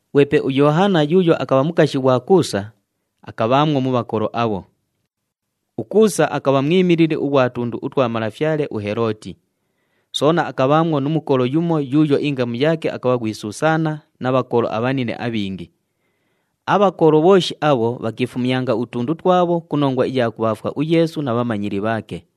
Ghwepe uYoohana yuuyo akabha mukashi ghwa Kuusa, akabhaamwo mu bhakolo abho. UKuusa akabha mwimilili ughwa tundu utwa malafyale uHelooti. Soona akabhaamwo nu mukolo yumo yuuyo ingamu yaake akabha ghwi Susaana na bhakolo abhanine abhingi. Abhakolo bhooshi abho bhakiifumyanga utundu twabho ku nongwa iya kubhaafwa uYeesu na bhamanyili bhaake.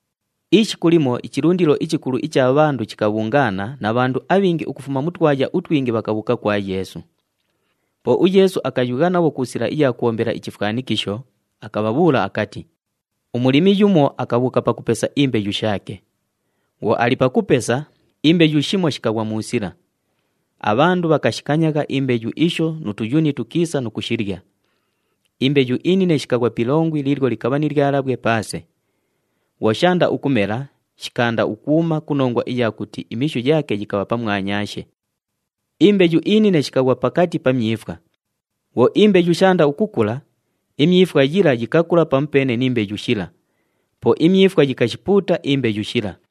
Ishiku limo ichilundilo ichikulu icha bhandu chikabhungaana na bhandu abhingi ukufuma mu twaya utwingi bhakabhuuka kwa Yeesu. Po uYeesu akayugha nabho ku sila iya kubhombela ichifwanikisho, akabhabhuula akati, “Umulimi yumo akabhuuka pakupesa imbeyu shaake. Bhwo ali pakupesa, imbeyu shimo shikaghwa mu sila. Abhandu bhakashikanyagha imbeyu isho nu tuyuni tukiisa nu kushilya. Imbeyu inine shikaghwa pi ilongwi liilyo likabha ni lyalabhwe paase. Bhwo shaanda ukumela, shikaanda ukuuma ku nongwa iya kuti imishu yaake yikabha pamwanyaashe. Imbeyu inine shikaghwa pakati pa myifwa. Bhwo imbeyu shaanda ukukula, imyifwa yila yikakula pamupeene ni mbeyu shila, po imyifwa yikashipuuta imbeyu shila.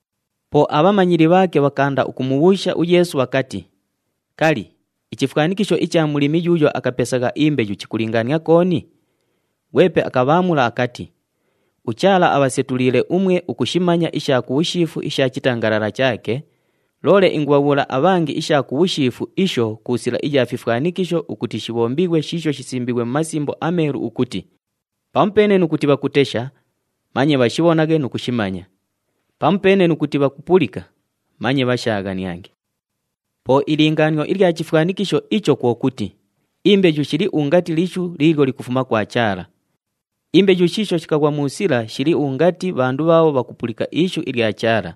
Po abhamanyili bhaake bhakaanda ukumubhuusha uYeesu bhakati, “Kali, ichifwanikisho icha mulimi yuuyo akapesagha imbeyu chikulingaania kooni?” Ghwepe akabhaamula akati, “UChaala abhasetuliile umwe ukushimanya isha ku bhushiifu isha chitangalala chaake, loole ingubhabhuula abhangi isha ku bhushiifu isho ku sila iya fifwanikisho ukuti shibhombighwe shiisho shisimbiighwe mu Masimbo aMeelu ukuti, ‘Pamupeene nu kuti bhakutesha, manye bhashibhonaghe nu kushimanya. Pamupeene nu kuti bhakupulika, manye bhashaaghaniange.’ “Po ilingaanio ilya chifwanikisho icho kwo kuti, imbeyu shili ungati lishu liilyo likufuma kwa Chaala. Imbeyu shiisho shikaghwa mu sila shili ungati bhandu bhaabho bhakupulika ishu ilya Chaala.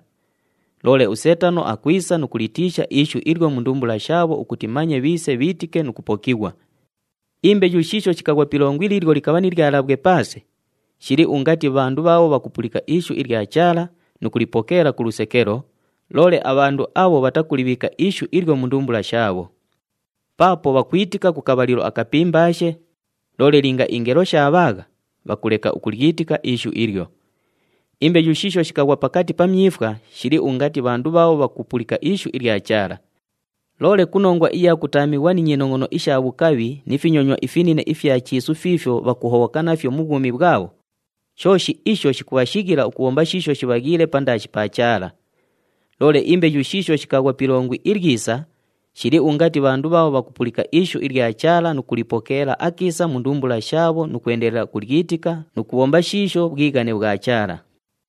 Loole uSeetano akwisa nu kulitiisha ishu ilyo mu ndumbula shaabho ukuti manye bhiise bhiitike nu kupokighwa. Imbeyu shiisho shikaghwa pi ilongwi liilyo likabha ni lyalabhwe paase, shili ungati bhandu bhaabho bhakupulika ishu ilya Chaala nu kulipokeela ku lusekelo, loole abhandu abho bhatakulibhiika ishu ilyo mu ndumbula shaabho. Paapo bhakwitika ku kabhalilo akapimbaashe, loole linga ingelo shaabhaagha, bhakuleka ukulyitika ishu ilyo. Imbeyu shiisho shikaghwa pakati pa myifwa shili ungati bhandu bhaabho bhakupulika ishu ilya Chaala. Loole ku nongwa iya kutaamighwa ni nyinongʼono isha bhukabhi ni finyonywa ifinine ifya chiisu fiifyo bhakuhobhoka nafyo mu bhwumi bhwabho, shooshi isho shikubhashighila ukubhomba shiisho shibhaghiile pandaashi pa Chaala. Loole imbeyu shiisho shikaghwa pi ilongwi ilyisa, shili ungati bhandu bhaabho bhakupulika ishu ilya Chaala nu kulipokeela akiisa mu ndumbula shaabho, nu kwendelela ukulyitika nu kubhomba shiisho bhwighane bhwa Chaala.”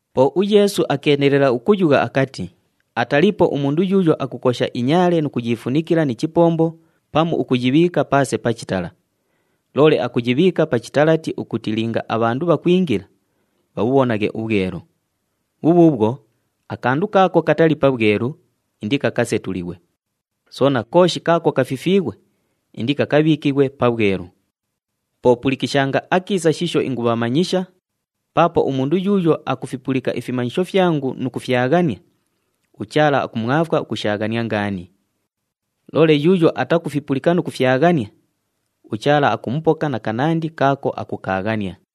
Po uYeesu akeendelela ukuyugha akati, “Ataliipo umundu yuuyo akukosha inyaale nu kuyiifunikila ni chipombo pamu ukuyibhiika paase pa chitala. Loole akuyibhiika pa chitalati ukuti linga abhandu bhakwingila, bhabhubhonaghe ubhwelu. Bhubhuubhwo, akandu kaako katali pabhwelu, indikakasetulighwe, soona kooshi kaako kafifiighwe, indikakabhiikighwe pabhwelu. “Po pulikishanga akiisa shiisho ingumanyisha, paapo umundu yuuyo akufipulika ifimanyisho fyangu nu kufyaghania, uChaala akumwafwa ukushaaghania ngaani. Loole yuuyo atakufipulika nu kufyaghania, uChaala akumupoka na kanandi kaako akukaaghania.”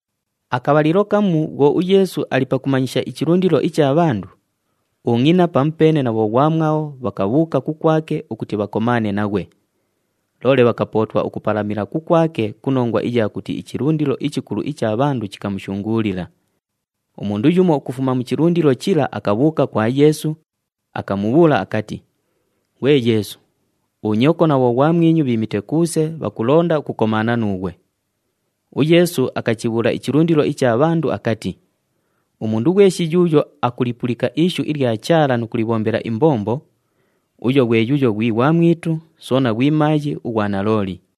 Akabhalilo kamu bhwo uYeesu ali pakuchimanyisha ichilundilo icha bhandu, ungʼina pamupeene na bhoghwamwabho bhakabhuuka kukwake ukuti bhakomaane naghwe, loole bhakapootwa ukupalamila kukwake ku nongwa iya kuti ichilundilo ichikulu icha bhandu chikamushunguulila. Umundu yumo ukufuma mu chilundilo chila akabhuuka kwa Yeesu, akamubhuula akati, “Ghwe Yeesu, unyoko na bhoghwamwinyu bhiimite kuuse, bhakulonda ukukomaana nuughwe.” UYeesu akachibhuula ichilundilo icha bhandu akati, “Umundu ghweshi yuuyo akulipulika ishu ilya Chaala nu kulibhombela imbombo, uyo ghwe yuuyo ghwi ghwamwitu, soona ghwi maayi ughwa nalooli.”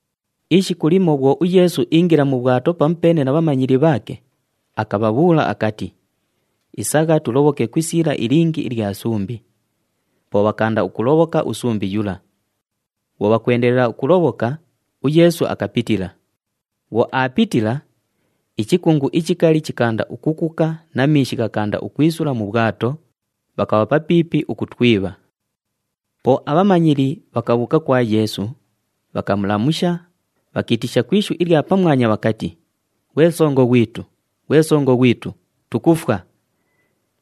Ishiku limo bhwo uYeesu iingila mu bhwato pamupeene na bhamanyili bhaake, akabhabhuula akati, “Isagha tulobhoke ku isiila ilingi ilya sumbi.” Po bhakaanda ukulobhoka usumbi yula. Bhwo bhakwendelela ukulobhoka, uYeesu akapitila. Bhwo aapitila, ichikungu ichikali chikaanda ukukuka na miishi ghakaanda ukwisula mu bhwato, bhakabha papiipi ukutwibha. Po abhamanyili bhakabhuuka kwa Yeesu, bhakamulamusha, bhakiitisha ku ishu ilya pamwanya bhakati, “Ghwe Songo ghwitu! Ghwe Songo ghwitu! Tukufwa!”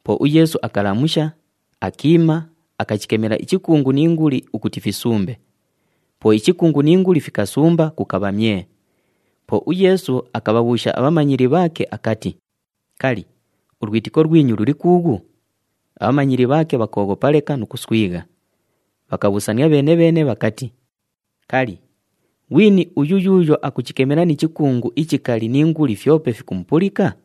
Po uYeesu akalamusha, akiima, akachikemela ichikungu ni nguli ukuti fisumbe. Po ichikungu ni nguli fikasumba, kukabha myee! Po uYeesu akabhabhuusha abhamanyili bhaake akati, “Kali, ulwitiko lwinyu luli kuughu?” Abhamanyili bhaake bhakooghopa leka nu kuswigha, bhakabhuusania bheene-bheene bhakati, “Kali, ghwini uyu yuuyo akuchikemela ni chikungu ichikali ni nguli fyope fikumupulika?”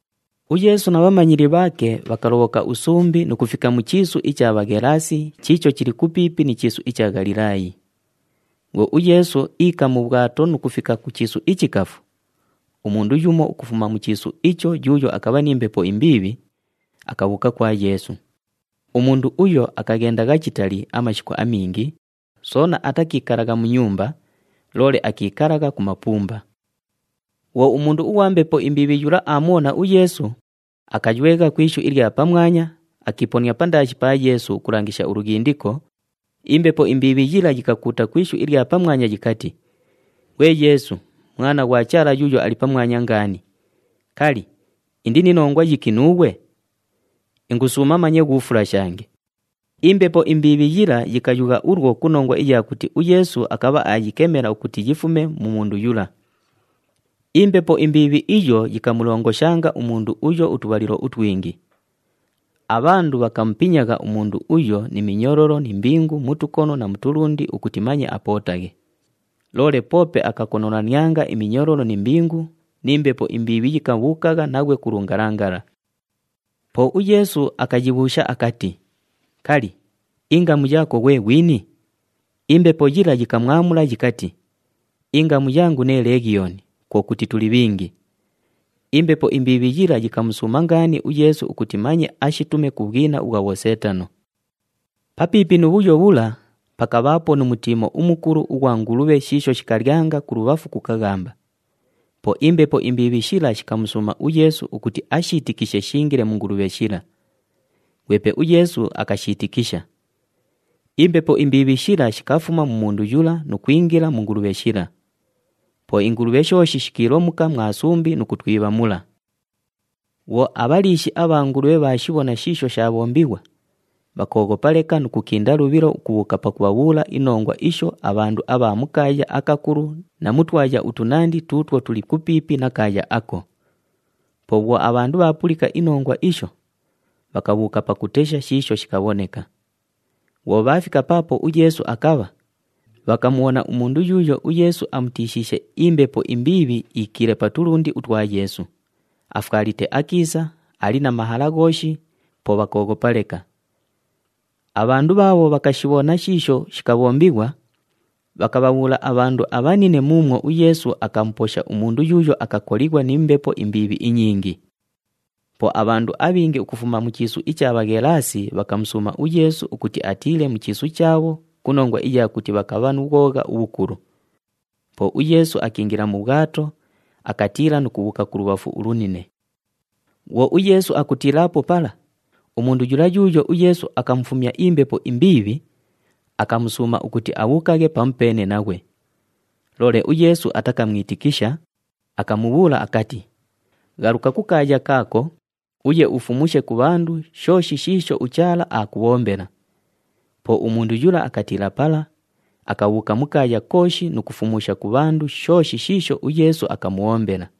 UYeesu na bhamanyili bhaake bhakalobhoka usumbi nu kufika mu chiisu icha Bhaghelaasi chiicho chili kupiipi ni chiisu icha Ghalilaayi. Bhwo uYeesu iika mu bhwato nu kufika ku chiisu ichikafu, umundu yumo ukufuma mu chiisu icho yuuyo akabha ni mbepo imbiibhi, akabhuuka kwa Yeesu. Umundu uyo akaghendagha chitali amashiku amingi, soona atakiikalagha mu nyumba, loole akiikalagha ku mapumba. Bhwo umundu ughwa mbepo imbiibhi yula aamubhona uYeesu, akaywegha ku ishu ilya pamwanya, akiiponia pandaashi pa Yeesu ukulangisha ulughindiko, imbepo imbiibhi yila yikakuuta ku ishu ilya pamwanya yikati, “Ghwe Yeesu, Mwana ghwa Chaala Yuuyo Ali Pamwanya Ngaani, kali, indi ni nongwa yiki nuughwe? Ingusuuma manye ghuufulashange.” Imbepo imbiibhi yila yikayugha ulwo ku nongwa iya kuti uYeesu akabha aayikemela ukuti yifume mu mundu yula. Imbepo imbiibhi iyo yikamulongoshanga umundu uyo utubhalilo utwingi. Abhandu bhakamupinyagha umundu uyo ni minyololo ni mbingu mu tukono na mu tulundi ukuti manye apootaghe, loole poope akakonolanianga iminyololo ni mbingu, ni mbepo imbiibhi yikabhuukagha naghwe ku lungalangala. Po uYeesu akayibhuusha akati, “Kali, ingamu yaako ghwe ghwini?” Imbepo yila yikamwamula yikati, “Ingamu yangu nee Leghiyooni, kwo kuti, tuli bhingi.” Imbepo imbiibhi yila yikamusuuma ngaani uYeesu ukuti manye ashitume ku bhwina ubhwa bhoseetano. Papiipi nu bhuyo bhula, pakabhaapo nu mutiimo umukulu ughwa ngulubhe shiisho shikalyanga kulubhafu ku kaghamba. Po imbepo imbiibhi shila shikamusuuma uYeesu ukuti ashiitikishe shiingile mu ngulubhe shila. Ghwepe uYeesu akashiitikisha. Imbepo imbiibhi shila shikafuma mu mundu yula nu kwingila mu ngulubhe shila. Po ingulubhe shooshi shikiilomuka mwa sumbi nu kutwibha mula. Bhwo abhaliishi abha ngulubhe bhaashibhona shiisho shaabhombighwa, bhakooghopa leka nu kukinda lubhilo ukubhuuka pakubhabhuula inongwa isho abhandu abha mu kaaya akakulu na mu twaya utunandi tuutwo tuli kupiipi na kaaya ako. Po bhwo abhandu bhaapulika inongwa isho, bhakabhuuka pakutesha shiisho shikabhoneka. Bhwo bhaafika paapo uYeesu akabha, bhakamubhona umundu yuuyo uYeesu amutiishiishe imbepo imbiibhi iikiile pa tulundi utwa Yeesu, afwalite akiisa, ali na mahala ghooshi, po bhakooghopa leka. Abhandu bhaabho bhakashibhona shiisho shikabhombighwa, bhakabhabhuula abhandu abhanine muumwo uYeesu akamuposha umundu yuuyo akakolighwa ni mbepo imbiibhi inyingi. Po abhandu abhingi ukufuma mu chiisu icha Bhaghelaasi bhakamusuuma uYeesu ukuti atiile mu chiisu chaabho ku nongwa iya kuti bhakabha nu bhwogha ubhukulu. Po uYeesu akiingila mu bhwato, akatiila nu kubhuuka kulubhafu ulunine. Bhwo uYeesu akutiilaapo pala, umundu yula yuuyo uYeesu akamufumya imbepo imbiibhi, akamusuuma ukuti abhuukaghe pamupeene naghwe. Loole uYeesu atakamwitikisha, akamubhuula akati, “Ghaluka kukaaya kaako uye ufumushe ku bhandu shooshi shiisho uChaala aakubhombela.” Po umundu yula akatiila pala, akabhuuka mu kaaya kooshi nu kufumusha ku bhandu shooshi shiisho uYeesu akamubhombela.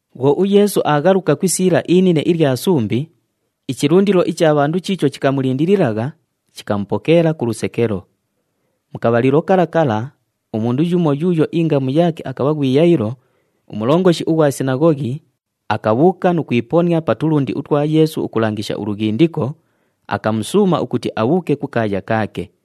Bhwo uYeesu aaghaluka ku isiila inine ilya sumbi, ichilundilo icha bhandu chiicho chikamulindililagha, chikamupokeela ku lusekelo. Mu kabhalilo kala kala umundu yumo yuuyo ingamu yaake akabha ghwi Yayilo, umulongoshi ughwa sinaghoghi, akabhuuka nu kwiponia pa tulundi utwa Yeesu ukulangisha ulughindiko, akamusuuma ukuti abhuuke kukaaya kaake.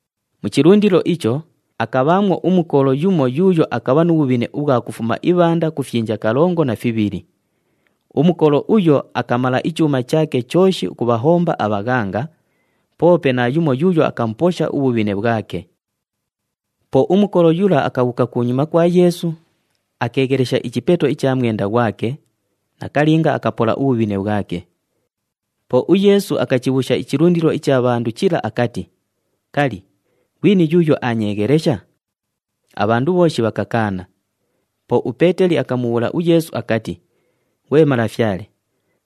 Mu chilundilo icho, akabhaamwo umukolo yumo yuuyo akabha nu bhubhine ubhwa kufuma ibhanda ku fyinja kalongo na fibhili. [Umukolo uyo akamala ichuuma chaake chooshi ukubhahomba abhaghanga,] poope naayumo yuuyo akamuposha ubhubhine bhwake. Po umukolo yula akabhuuka kunyuma kwa Yeesu, akeeghelesha ichipeto icha mwenda ghwake, nakalinga akapola ubhubhine bhwake. Po uYeesu akachibhuusha ichilundilo icha bhandu chila akati, “Kali, ghwini yuuyo aanyeeghelesha?” Abhandu bhooshi bhakakaana. Po uPeeteli akamubhuula uYeesu akati, “Ghwe Malafyale,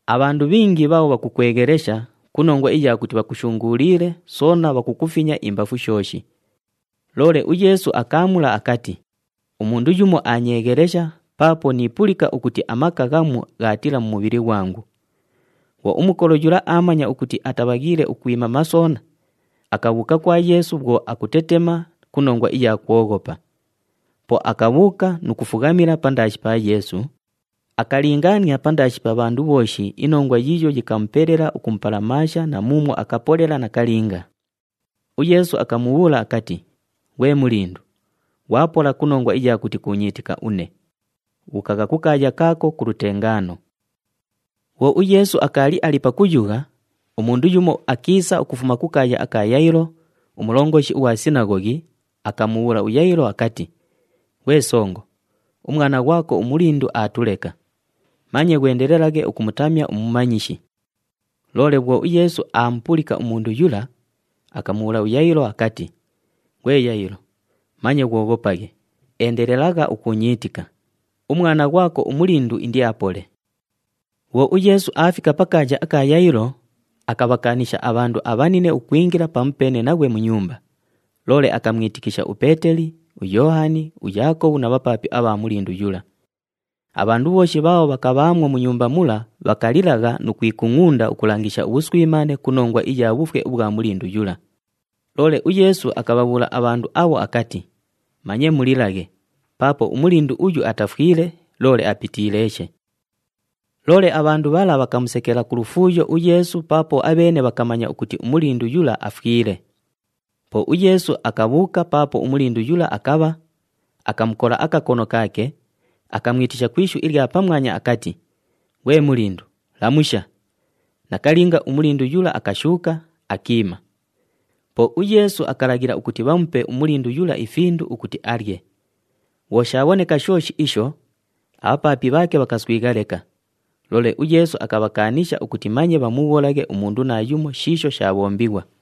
abhandu bhingi bhaabho bhakukweghelesha ku nongwa iya kuti bhakushunguuliile soona bhakukufinya imbafu shooshi!” Loole uYeesu akaamula akati, “Umundu yumo aanyeeghelesha paapo niipulika ukuti amaka ghamu ghaatiila mu mubhili ghwangu.” Bhwo umukolo yula aamanya ukuti atabhaghiile ukwimama soona, akabhuuka kwa Yeesu bhwo akutetema ku nongwa iya kwoghopa. Po akabhuuka nu kufughamila pandaashi pa Yeesu, akalingaania pandaashi pa bhandu bhooshi inongwa yiiyo yikamupelela ukumupalamaasha na muumwo akapolela nakalinga. UYeesu akamubhuula akati, “Ghwe mulindu, ghwapola ku nongwa iya kuti kuunyiitika une. Bhuukagha kukaaya kaako ku lutengaano.” Bhwo uYeesu akaali ali pakuyugha, umundu yumo akiisa ukufuma kukaaya aka Yayilo, umulongoshi ughwa sinaghoghi, akamubhuula uYayilo akati, “Ghwe songo, umwana ghwako umulindu aatuleka! Manye ghwendelelaghe ukumutamya uMumanyishi.” Loole bhwo uYeesu aamupulika umundu yula, akamubhuula uYayilo akati, “Ghwe Yayilo, manye ghwoghopaghe, endelelagha ukuunyiitika. Umwana ghwako umulindu indiapole.” Bhwo uYeesu aafika pakaaya aka Yayilo, akabhakaanisha abhandu abhanine ukwingila pamupeene naghwe mu nyumba, loole akamwitikisha uPeeteli, uYoohani, uYaakobhu na bhapaapi abha mulindu yula. Abhandu bhooshi bhaabho bhakabhaamwo mu nyumba mula bhakalilagha nu kwikungʼunda ukulangisha ubhuswimaane ku nongwa iya bhufwe ubhwa mulindu yula. Loole uYeesu akabhabhuula abhandu abho akati, “Manye mulilaghe paapo umulindu uyu atafwile loole apitiileeshe!” Loole abhandu bhala bhakamusekela ku lufuuyo uYeesu paapo abheene bhakamanya ukuti umulindu yula afwile. Po uYeesu akabhuuka paapo umulindu yula akabha, akamukola akakono kaake, akamwitisha ku ishu ilya pamwanya akati, “Ghwe mulindu, lamusha!” Nakalinga, umulindu yula akashuuka, akiima. Po uYeesu akalaghila ukuti bhamupe umulindu yula ifindu ukuti alye. Bhwo shaabhoneka shooshi isho, abhapaapi bhaake bhakaswigha leka, loole uYeesu akabhakaanisha ukuti manye bhamubhuulaghe umundu naayumo shiisho shaabhombighwa.